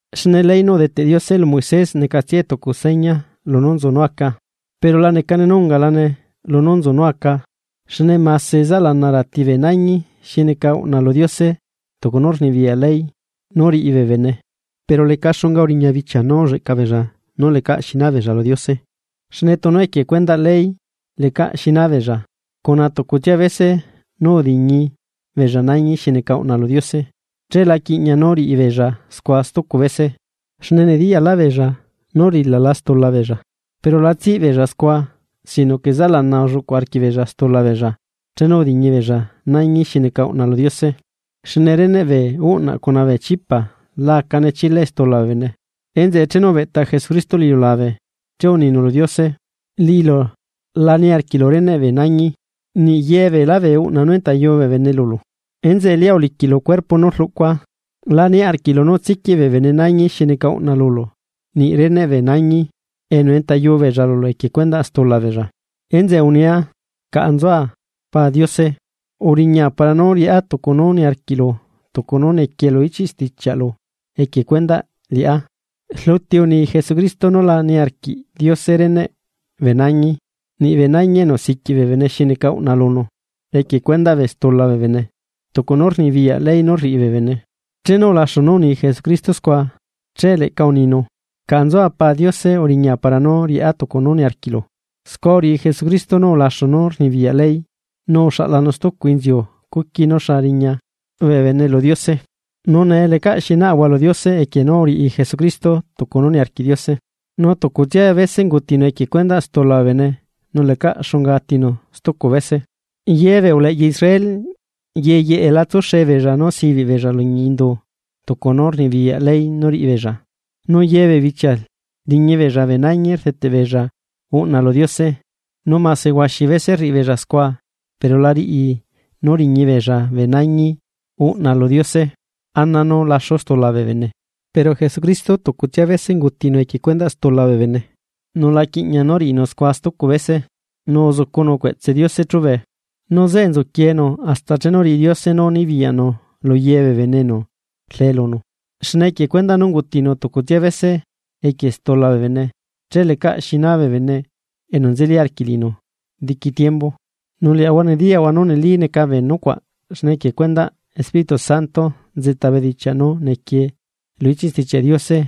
Xne ley nú udeteꞌ Diose lu Moisés necatsiae tucu seña lunú nzu nú aca, pero la necane nú ungalane lunú nzu nú aca xne mase zaꞌlana rati bee nañi xi neca uꞌna lu Diose tucu nú rnibiyaꞌ ley nú riꞌi bee bene, pero leca xunga uriña bichia nú ulleꞌca beella nú lecaꞌ xina beella lu Diose. Xne tunu equie cuendaꞌ ley lecaꞌ xi naa beella, cuna tucutsia bese nú udiñi beella nañi xi neca uꞌna lu Diose, che la quiꞌñaꞌ nú riꞌi beella scua stucu bese, xne nediyaꞌlaꞌ beella nú urilala stula beella. Pero la tsiꞌbeella scua sino que zaꞌlana ulluꞌcu arquiꞌbeella stula beella chenu udiñi beella nañi xi neca uꞌna lu Diose. Xne reneꞌ bee uꞌnaꞌ cuna bee chipa la acane chilae stula bee bene. Enzeꞌe, chenu ubeꞌta Jesucristo lu iliulabe, che uninu lu Diose: Liꞌilu la niarquiꞌlu reneꞌ bee nañi, niꞌ ye beela bee uꞌna nú entayu bee bene lulu, enzeꞌe lia uliquiꞌlu cuerpo nú rluꞌcua. La niaꞌ arquiꞌlu nú tsiquiꞌ bee bene nañi xi neca uꞌna lulu, niꞌ reneꞌ bee nañi nú entayuu beella lulu equie cuendaꞌ stula beella. Enzeꞌe unia: “Caꞌa nzua, Pa Diose, uriña para nú riꞌá tucu nú niarquiꞌlu, tucu nú nequie lu ichiꞌ stichiaꞌlu equie cuendaꞌ liꞌá.” Rluti uni Jesucristo nú la niarquiꞌ Diose reneꞌ bee nañi, niꞌ bee nañi enu siquiꞌ bee bene xi neca uꞌna lunu, equie cuendaꞌ bee stula bee bene, tucu nú rnibiyaꞌ ley nú riꞌi bee bene. Chenu ulaxu nú uni Jesucristo scua, che leꞌca uninu: “Caꞌa nzua Pa Diose uriña para nú riꞌá tucu nú niarquiꞌlu.” Scua uriꞌi Jesucristo nú ulaxu nú rnibiyaꞌ ley nu uxaꞌlanu stucu inziu cuqui nú xa riña bene lu Diose. Nu nee lecaꞌ xi naꞌahua lu Diose equie nú uriꞌi Jesucristo tucu nú niarquiꞌ Diose, nu tucutsia bese ungutinu equie cuendaꞌ stula bee bene nu lecaꞌ xunga atinu stucu bese. Yebee uleꞌya Israel yeyeꞌe la tsuxe beella nú sibiꞌ beella liñi indu tucu nú rnibiyaꞌ ley nú riꞌibeella nu ye bee bichia riñi beella bee nañi rdeteꞌ beella uꞌna lu Diose. Nu mase huaxi bese rriꞌibeella scua pero la riꞌi nú riñi beella bee nañi uꞌna lu Diose ana nú laxu stula bee bene. Pero Jesucristo tucutsia bese ungutinu equie stula bee bene, nu la quiꞌña nú riꞌinu scua stucu bese. Nu uzucunu cueꞌtse Diose chúbe. Nu zeꞌe nzuquienu hasta chenu riꞌi Diose nú nibiyaꞌnu luyebee bene enu rle lunu. Xne equie cuendaꞌ nú ungutinu tucutsia bese equie stula bee bene, che lecaꞌ xina bee bene enu nzeli arquiꞌ liꞌinu diqui tiembu. Nu liaꞌahua nediyaꞌahua nú neli neca bee nucuaꞌ xne equie cuendaꞌ Espíritu Santo nzeꞌta bedichiaꞌ nú nequie lu ichiꞌ Stichiaꞌ Diose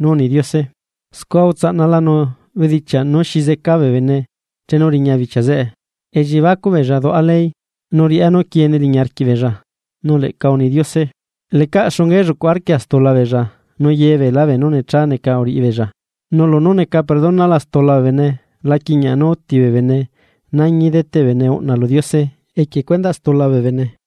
nú uni Diose: Scua utsaꞌnalanu bedichiaꞌ nú xi zeca bee bene chenu riña bichia zeꞌe, elliebacuꞌ beella duꞌa ley. Nu riaꞌá nú quiene liñi arquiꞌbeella. Nu leꞌca uni Diose: Lecaꞌ xunga ellucuꞌ arquia stulabeella nu yebeelá beenú necha neca uriꞌibeella. Nu lunú neca perdonala stula bee bene la quiꞌñaꞌ nú uti bee bene nañi deteꞌ bee bene uꞌna lu Diose equie cuendaꞌ stula bee bene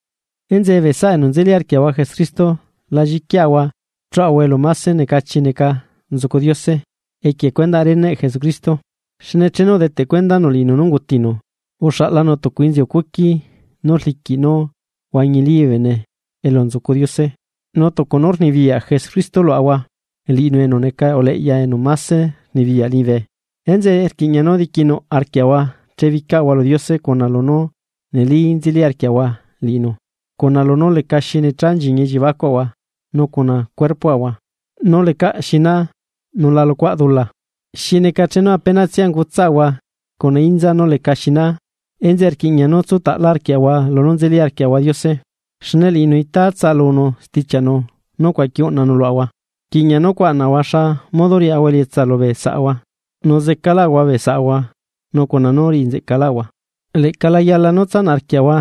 Enzeꞌe, bee saꞌa enu nzeli arquiaꞌahua Jesucristo la lliquiaꞌahua chuaꞌahua elu máse necachi neca nzucu Diose equie cuendaꞌ reneꞌ Jesucristo. Xne chenu udeteꞌ cuendanu liꞌinu nú ungutinu, uxaꞌlanu tucu inziu cuqui nú rliquiꞌ nú huañili bee bene elu nzucu Diose. Nu tucu nú rnibiyaꞌ Jesucristo luaꞌahua, liꞌinu enu neca uleꞌya enu máse rnibiyaꞌ liñibe. Enzeꞌe rquiꞌña nú diquinuꞌ arquiaꞌahua chebicaꞌahua lu Diose cuna lunú neli nzeli arquiaꞌahua liꞌinu, cuna lunú lecaxi necha nchiñi elliebacuaꞌahua nu cuna cuerpoꞌahua nú lecaꞌ xinaa nú la luꞌcuaꞌ dula, xi neca chenu apenatsia ungutsaꞌahua cuna inza nú leca xina. Enzeꞌe rquiꞌña nú tsutaꞌla arquiaꞌahua lunú nzeli arquiaꞌahua Diose, xne liꞌinu itaa tsaꞌalunu stichiaꞌnu nú ucuaqui uꞌnanu luaꞌahua. Rquiꞌña nu cuaꞌnaꞌahua xa modo riaꞌahua elietsa lubee saꞌahua nu zecalaꞌahua bee saꞌahua nu cuna nú riꞌi nzeꞌcaꞌahua. Leꞌca la yala nú tsanaꞌ arquiaꞌahua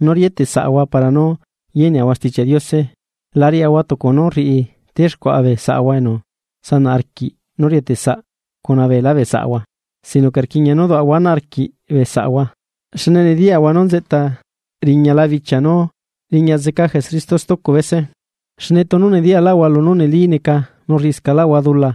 nú rieteꞌsaꞌahua para nú yeneꞌahua Stichiaꞌ Diose la riaꞌahua tucu nú rriꞌi texcuaꞌa bee saꞌahua enu sanaꞌ arquiꞌ nú rieteꞌsaꞌ cuna beelá bee saꞌahua, sino que rquiꞌña nú duaꞌahua ana arquiꞌ bee saꞌahua, xne nediyaꞌahua nú nzeꞌta riñala bichia nú riña zeca Jesucristo stucu bese. Xne tunu nediyaꞌlaꞌahua lunú neli neca nu rriꞌiscaꞌlaꞌahua dula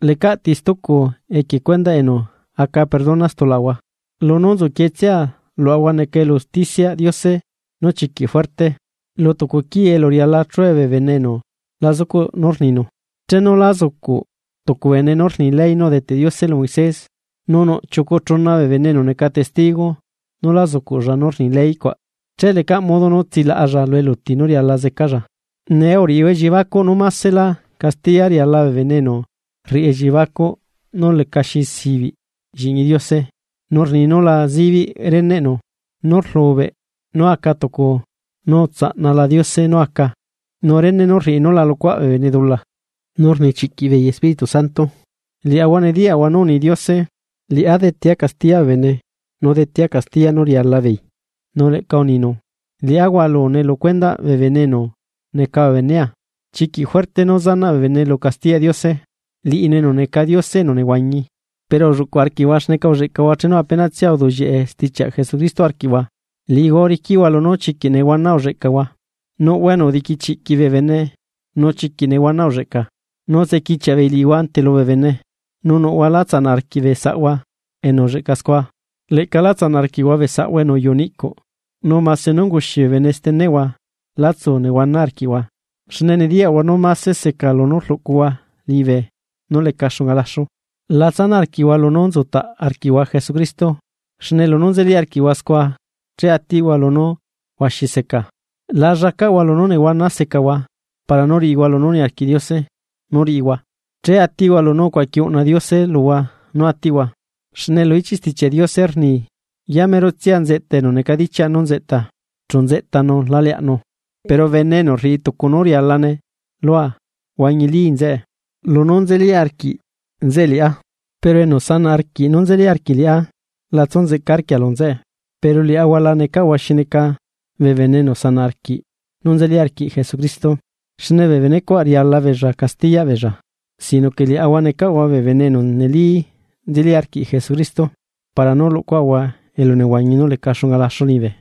lecaꞌ ti stucu enu ati equie cuendaꞌ stulaꞌahua. Lunú nzuquietsia luaꞌahua neca elu usticiaꞌ Diose nú chiquiꞌ fuerte, lu tucu quii elu riala chue bee bene enu la zucuꞌ nú rninu. Chenu la zucuꞌ tucu bene nú rni ley nú udeteꞌ Diose lu Moisés, nu nuꞌ chiucu chuna bee bene enu neca testigo nú la zucuꞌlla nú rni ley cuaꞌ, che lecaꞌ modo nú tsilaꞌalla lu eluti nú riala zecalla. Nee uriꞌihua elliebacuꞌ, ¿nú masescaꞌlá castiya riala bee bene enu rriꞌi elliebacuꞌ nú lecaxi zibiꞌ lliꞌñi Diose? Nu rni nú la zibiꞌ reneꞌnu nú rlubeꞌ nú aca tucu nú utsaꞌnala Diose nú aca, nu rene nú rriꞌi nú la luꞌcuaꞌ bee bene dula, nu rnichiꞌquiꞌ beei Espíritu Santo. Liaꞌahua nediyaꞌahua nú uni Diose: “Liꞌá detea castiya bee bene nu detea castiya nú riala beei.” Nu leꞌca uninu: “Liꞌá hualune lu cuendaꞌ bee bene enu neca bee benea.” Chiquiꞌ juerte nú zanaꞌ bene lu castiyaꞌ Diose. Liꞌinu enu neca Diose enu nehuañi. Pero ulluꞌcuꞌ arquiꞌhua xneca ulleꞌcahua chenu apenatsia uduꞌllieꞌe stichiaꞌ Jesucristo arquiꞌhua. Liꞌihua uriquiꞌhua lunú chiquiꞌ nehuana ulleꞌcahua. Nuꞌhua enu udiquichiꞌquiꞌ bee bene nu chiquiꞌ nehuana ulleꞌca, nu utsequichiaꞌ beei liꞌihua ante lubee bene, nu nuꞌhua lá tsanaꞌ arquiꞌ bee saꞌhua enu ulleꞌca scua. Leꞌca lá tsanaꞌ arquiꞌhua bee saꞌhua enu uyuꞌu niꞌcuꞌ, nu mase nú unguxi bee bene steneꞌhua lá tsu nehuana arquiꞌhua xne nediyaꞌhua nú máse seca nú rluꞌcuhua liñibe nú leca xunga laxu. La tsanaꞌ arquiꞌhua lunú nzutaꞌ arquiꞌhua Jesucristo, xne lunú nzeli arquiꞌhua scua che atiꞌhua lunú huaxi seca. La llacaꞌhua lunú nehuana secahua para nú riꞌihua lunú niarquiꞌ Diose nú riꞌihua, che atiꞌhua lunú ucuaqui uꞌnala Diose luhua nú atiꞌhua. Xne lu ichiꞌ Stichiaꞌ Diose rni: Yamerotsia nzeꞌta enu necadichiaꞌ nú nzeꞌta. Chu nzeꞌtanu la leaꞌnu. Pero bene enu rriꞌi tucu nú rialane lua huañili nzeꞌe, lunú nzeli arquiꞌ nzeꞌe liꞌá, pero enu sanaꞌ arquiꞌ nú nzeli arquiꞌ liꞌá la tsu nzeꞌca arquia lu nzeꞌe. Pero liaꞌahua la necaꞌahua xi neca bee bene enu sanaꞌ arquiꞌ nú nzeli arquiꞌ Jesucristo xne bee benecuaꞌ riala beella castiyaꞌ beella, sino que liaꞌahua necaꞌahua bee bene enu neli nzeli arquiꞌ Jesucristo, para nú luꞌcuaꞌahua elunehuañi nú leca xunga laxu liñibe.